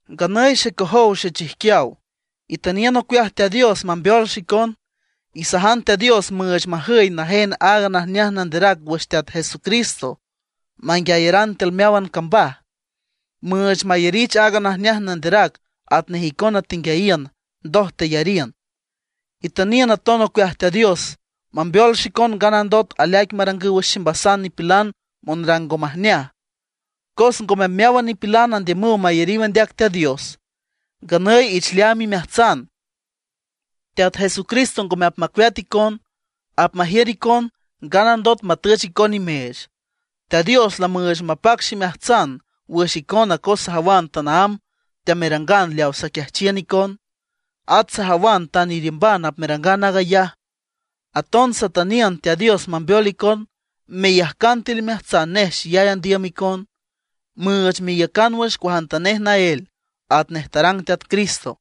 Nganüy xecojow xechijquiaw, itüniün ocueaj Teat Dios mambeol xicon. Isajan Teat Dios müüch majüy najen aaga najneaj nanderac wüx Teat Jesucristo manguiayaran tiül meáwan cambaj, müüch mayarich aaga najneaj nanderac atnej icona tenguiayiün, ndoj teyariün. Itüniün aton ocueaj Teat Dios mambeol xicon nganandot aleaic marangüw wüx ximbasan nipilan monrang ngo majneaj, cos ngome meáwan nipilan andiümüw mayariw andeac Teat Dios. Nganüy ich leaam imeajtsan, Teat Jesucristo ngome apmacueat icon; apmajiür icon nganandot matüch icon nimeech. Teat Dios lamüüch mapac ximeajtsan wüx icona cos sajawan tanaámb teamerangan leaw saquiajchiün icon; at sajawan tan iriümban apmerangan aag ayaj. Aton satüniün Teat Dios mambeol icon meyajcan tiül imeajtsan nej xeyay andiüm icon, müüch meiücan wüx cuajantanej naél atnej tarang Teat Cristo.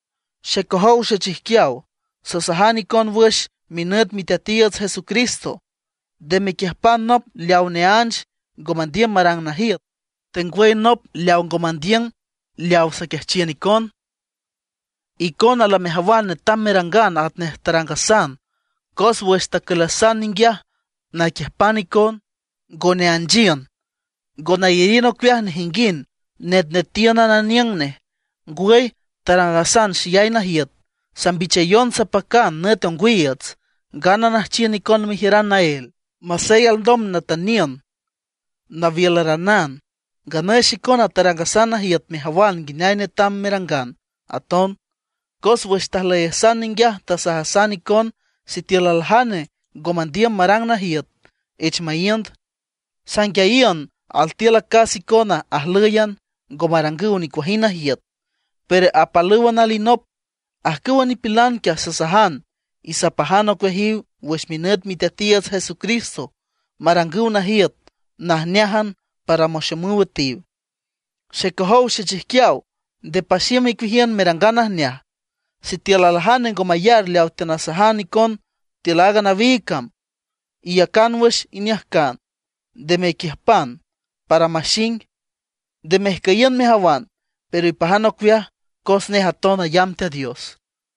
Xecojow xechijquiaw, sasajan icon wüx minüt Miteatiiüts Jesucristo, nde mequiüjpan nop leawa neánch ngo mandiüm marang najiüt, tengwüy nop leawa ngo mandiüm marang leawa saquiajchiün icon. Icona lamejawan netam merangan atnej tarangasan, cos wüx tacülasan ninguiaj naquiüjpan icon, ngo neanchiün. Ngo nayariün ocueaj nejinguind netnetíünan aniüng nej. Ngwüy tarangasan xeyay najiüt, sambichayon sapacan nüt ongwiiüts, ngana nüjchiün icon mejiüran naél. Masey alndom natüniün nawiülaranan, ngwüy xicona tarangasan najiüt mejawan nguineay netam merangan aton. Cos wüx tajlüyasan ninguiaj tasajasan icon sitiül aljane ngo mandiüm marang najiüt, ich maíünd. Sanguiayiün altiül acas icona ajlǘyan, ngo marangüw nicuajind najiüt, pero apalpalǘwan alinop. Ajcüwa nipilan quiaj, sasajan y sapajan ocueajiw wüx minüt Miteatiiüts Jesucristo, marangüw najiüt najneájan para maxomüw üetiw. Xecojow xechijquiaw, nde paxiüm icueajiün merangan najneaj. Sitiül aljane ngo mayar leawa teanasajan icon tiül aaga nawiig cam, iyacan wüx iniüjcan, nde mequiüjpan, para maxing. Nde mejcüyiün mejawan, pero ipajan ocueaj cos nej aton ayamb Teat Dios.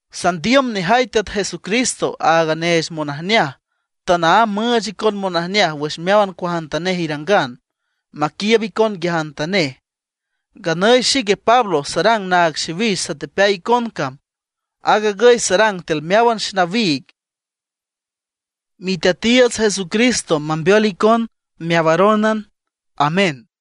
Sandiüm nejay Teat Jesucristo, aaga neech monajneaj, tanaámb müüch icon monajneaj wüx meáwan cuajantanej irangan, maquiiüb icon nguiajantanej. Nganüy xique Pablo sarang naag xiwix satepeay icon cam. Aag agüy sarang tiül meáwan xenawiig. Miteatiiüts Jesucristo mambeol icon meawarónan. Amén.